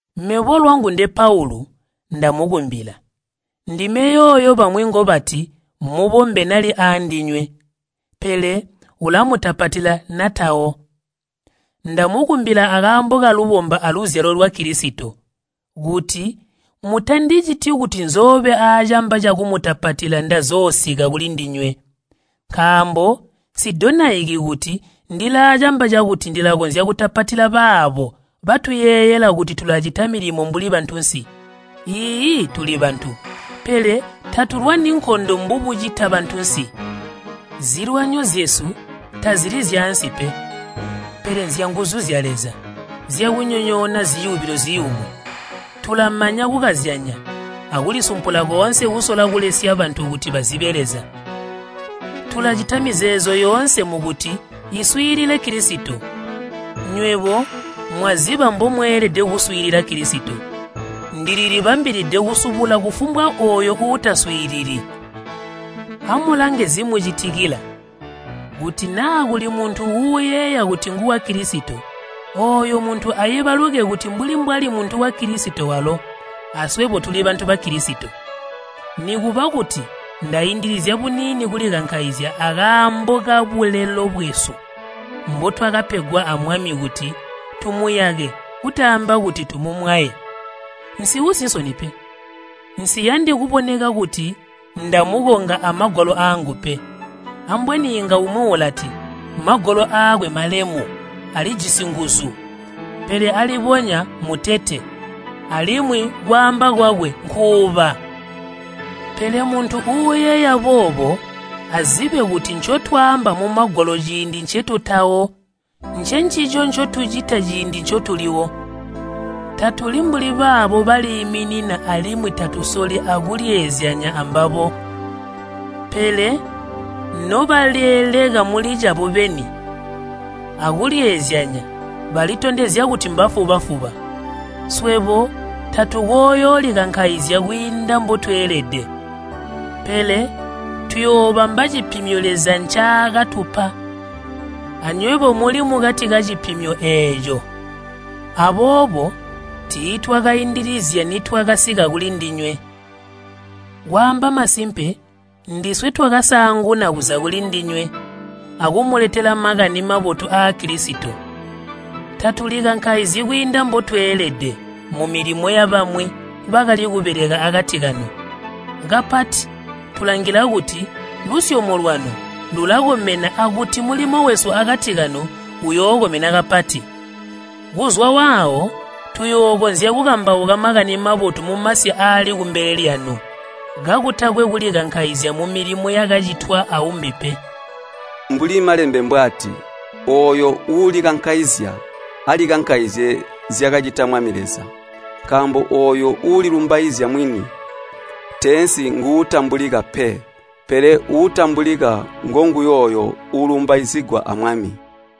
Mebo lwangu nde Paulu ndamukumbila, ndime yooyo bamwi ngobati mubombe nali aandinywe, pele ulamutapatila natawo. Ndamukumbila akaambo kalubomba aluzyalo lwa Kilisito, kuti mutandiciti kuti nzoobe aacamba cakumutapatila ndazoosika kulindinywe. Nkaambo nsidonaiki kuti ndilaacamba cakuti ndilakonzya kutapatila baabo batuyeeyela kuti tulacita milimo mbuli bantunsi. Iiyi, tuli bantu, pele tatulwani nkondo mbubucita bantunsi. Zilwanyo zyesu tazili zyaansi pe, pele nzyanguzu zya Leza zyakunyonyoona ziyubilo ziyumu. Tulamanya kukazyanya akulisumpula koonse kusola kulesya bantu kuti bazibe Leza. Tulcita mizeezo yoonse mukuti iswiilile Kilisito. Nywebo mwaziba mbomweelede kuswiilila Kilisito, ndililibambilide kusubula kufumbwa ooyo uutaswiilili. Amulange zimucitikila. Kuti naa kuli muntu uuyeeya kuti nguwa Kilisito, ooyo muntu aibaluke kuti mbuli mbwali muntu wa Kilisito walo, aswebo tuli bantu ba Kilisito. Nikuba kuti ndaindilizya buniini kulikankaizya akaambo kabulelo bwesu mbotwakapegwa a Mwami kuti tumuyake kutaamba kuti tumumwaye, nsiusi nsoni pe. Nsiyandi kuboneka kuti ndamukonga amagwalo aangu pe. Ambweni inga umwi ulati, “Magwalo aakwe malemu, alijisi nguzu, pele alibonya mutete, alimwi kwaamba kwakwe nkuuba.” Pele muntu uuyeeya boobo azibe kuti ncotwaamba mumagwalo ciindi ncetutawo, ncencico ncotucita ciindi ncotuliwo. Tatuli mbuli baabo baliiminina alimwi tatusoli akulyeezyanya ambabo. Pele nobalyeeleka muli cabo beni akulyeezyanya balitondezya kuti mbafuba-fuba. Swebo tatukooyoolikankaizya kwiinda mbotweelede, pele tuyoobamba cipimyo Leza ncaakatupa, anywebo muli mukati mwacipimyo eeco. Aboobo tiitwakaindilizya nitwakasika kulindinywe. Kwaamba masimpe, ndiswe twakasaanguna kuza kulindinywe akumuletela Makani Mabotu aa Kilisito. Tatulikankaizyi kwiinda mbokweelede mumilimo yabamwi bakali kubeleka akati kanu. Kapati tulangila kuti lusyomo lwanu lulakomena akuti mulimo wesu akati kanu uyookomena kapati, kuzwa waawo tuyookonzya kukambauka Makani Mabotu mumasi aali kumbele lyanu, kakutakwe kulikankaizya mumilimo yakacitwa aumbi pe. Mbuli Malembe mbwaati, “Ooyo uulikankaizya alikankaizizye zyakacita Mwami Leza.” Nkaambo ooyo uulilumbaizya mwini teensi nguutambulika pe, pele uutambulika nguyooyo uulumbaizigwa a Mwami.